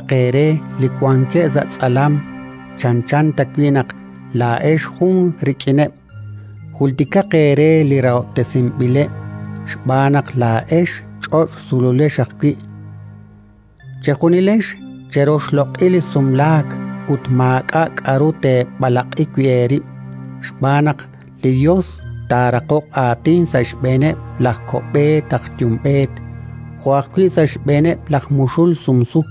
Jultikaq eere li wankeb' sa' tz'alam, chanchan ta wi' naq laa'ex jun rik'ineb'. Jultikaq eere li rahob'tesinb'ileb', xb'aan naq laa'ex ch'och' sululex ajwi'. Chejunilex cheroxloq'i li sumlaak ut maak'a' k'aru teeb'alaq'i wi' eerib', xb'aan naq li Yos taaraqoq aatin sa' xb'eeneb' laj ko'b'eet laj yumb'eet jo' ajwi' sa' xb'eeneb' laj muxul sumsu.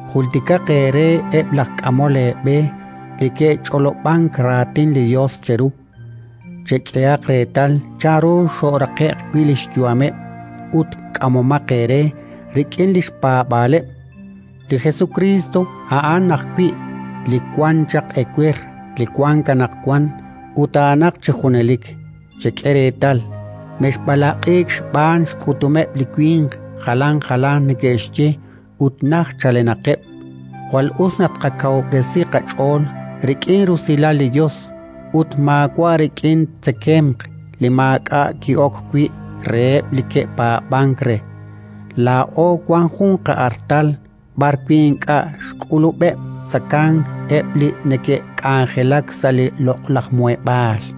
Jultikaq eere eb' laj k'amol eeb'e li ke'ch'olob'ank raatin li Yos cheru. Chek'ehaq reetal chanru xo'raqe'q wi' li xyu'ameb', ut k'amomaq eere rik'in li xpaab'aaleb'. Li Jesukriist a'an ajwi' li wan chaq ewer, li wank anaqwan; ut a'anaq chi junelik. Chek'e reetal, mexb'alaq'iik xb'aan xk'utomeb' li winq jalan jalanq neke'xye ut najt chalenaqeb'. Jwal us naq tqakawub'resi qach'ool rik'in rusilal li Yos, ut maawa' rik'in tzekemq li maak'a' ki'ok wi' reheb' li ke'paab'ank re. Laa'o wank jun qa'artal b'arwi' ink'a' xk'ulub'eb' tzekank eb' li neke'k'anjelak sa' li loq'laj Muheb'aal.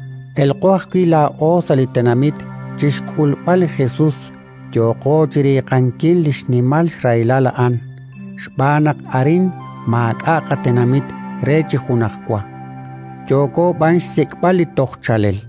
Elqo ajwi' laa'o sa' li tenamit chi xk'ulb'al li Jesus, yooqo chi riiqankil li xnimal xrahilal a'an, xb'aan naq arin maak'a' qatenamit re chi junajwa, yooko b'an xsik'b'al li toj chaalel.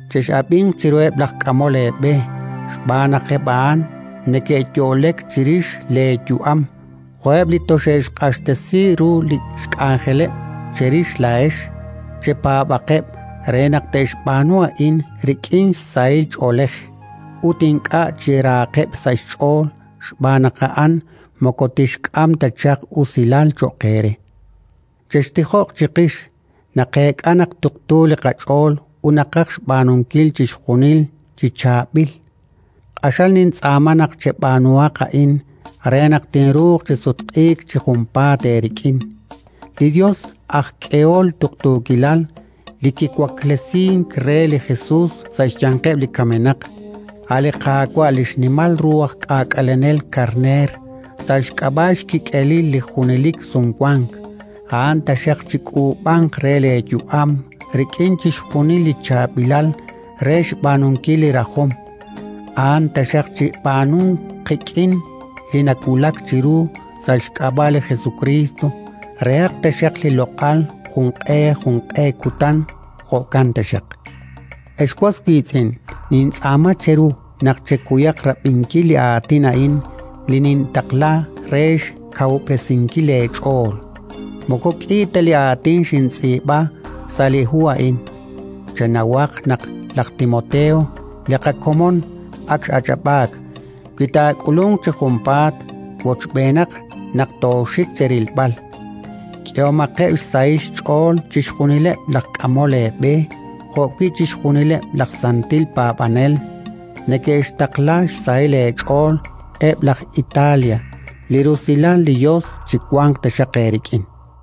Chex'ab'inq chiruheb' laj k'amol eeb'e xb'aan naq eb' a'an neke'yo'lek chirix leeyu'am jo'eb' li toxe'xq'axtesi ru li xk'anjeleb' cherix laa'ex. Chepaab'aqeb' re naq te'xb'aanu a'in rik'in sahil ch'oolej, ut ink'a' chi rahaqeb' sa' xch'ool, xb'aan naq a'an moko tixk'am ta chaq usilal cho'q eere. Chextijoq chiqix: naqeek'a naq tuqtu li qach'ool ut naqaj xb'aanunkil chixjunil chi chaab'il. Q'axal nintz'aama naq cheb'aanuhaq a'in re naq tinruuq chi sutq'iik chi junpaat eerik'in. Li Yos aj k'ehol tuqtuukilal, li kiwaklesink re li Jesus sa' xyanqeb' li kamenaq, a' li Qaawa', li xnimal ru aj K'aak'alenel karneer sa' xk'ab'a' xkik'elil li junelik Sumwank, a'an taxaq chik'uub'anq re leeyu'am rik'in chixjunil li chaab'ilal re xb'aanunkil li rajom. A'an taxaq chib'aanunq qik'in li nawulak chiru sa' xk'ab'a' li Jesukriist: rehaq taxaq li loq'al junq'e junq'e kutan. Jo'kan taxaq. Ex was wiitz'in, nintz'aama cheru naq chekuyaq rab'inkil li aatin a'in li nintaqla re xkawub'resinkil leech'ool: moko k'i ta li aatin xintz'iib'a sa' li hu a'in. Chenawaq naq laj Timoteo, li qakomon, ak x'ach'ab'aak. Wi taak'ulunq chi junpaat, wochb'eenaq naq tooxik cherilb'al. K'ehomaqeb' xsahil xch'ool chixjunileb' laj k'amol eeb'e jo'wi' chixjunileb' laj santil paab'anel. Neke'xtaqla xsahil eech'ool eb' laj Italia. Li rusilal li Yos chiwanq taxaq eerik'in.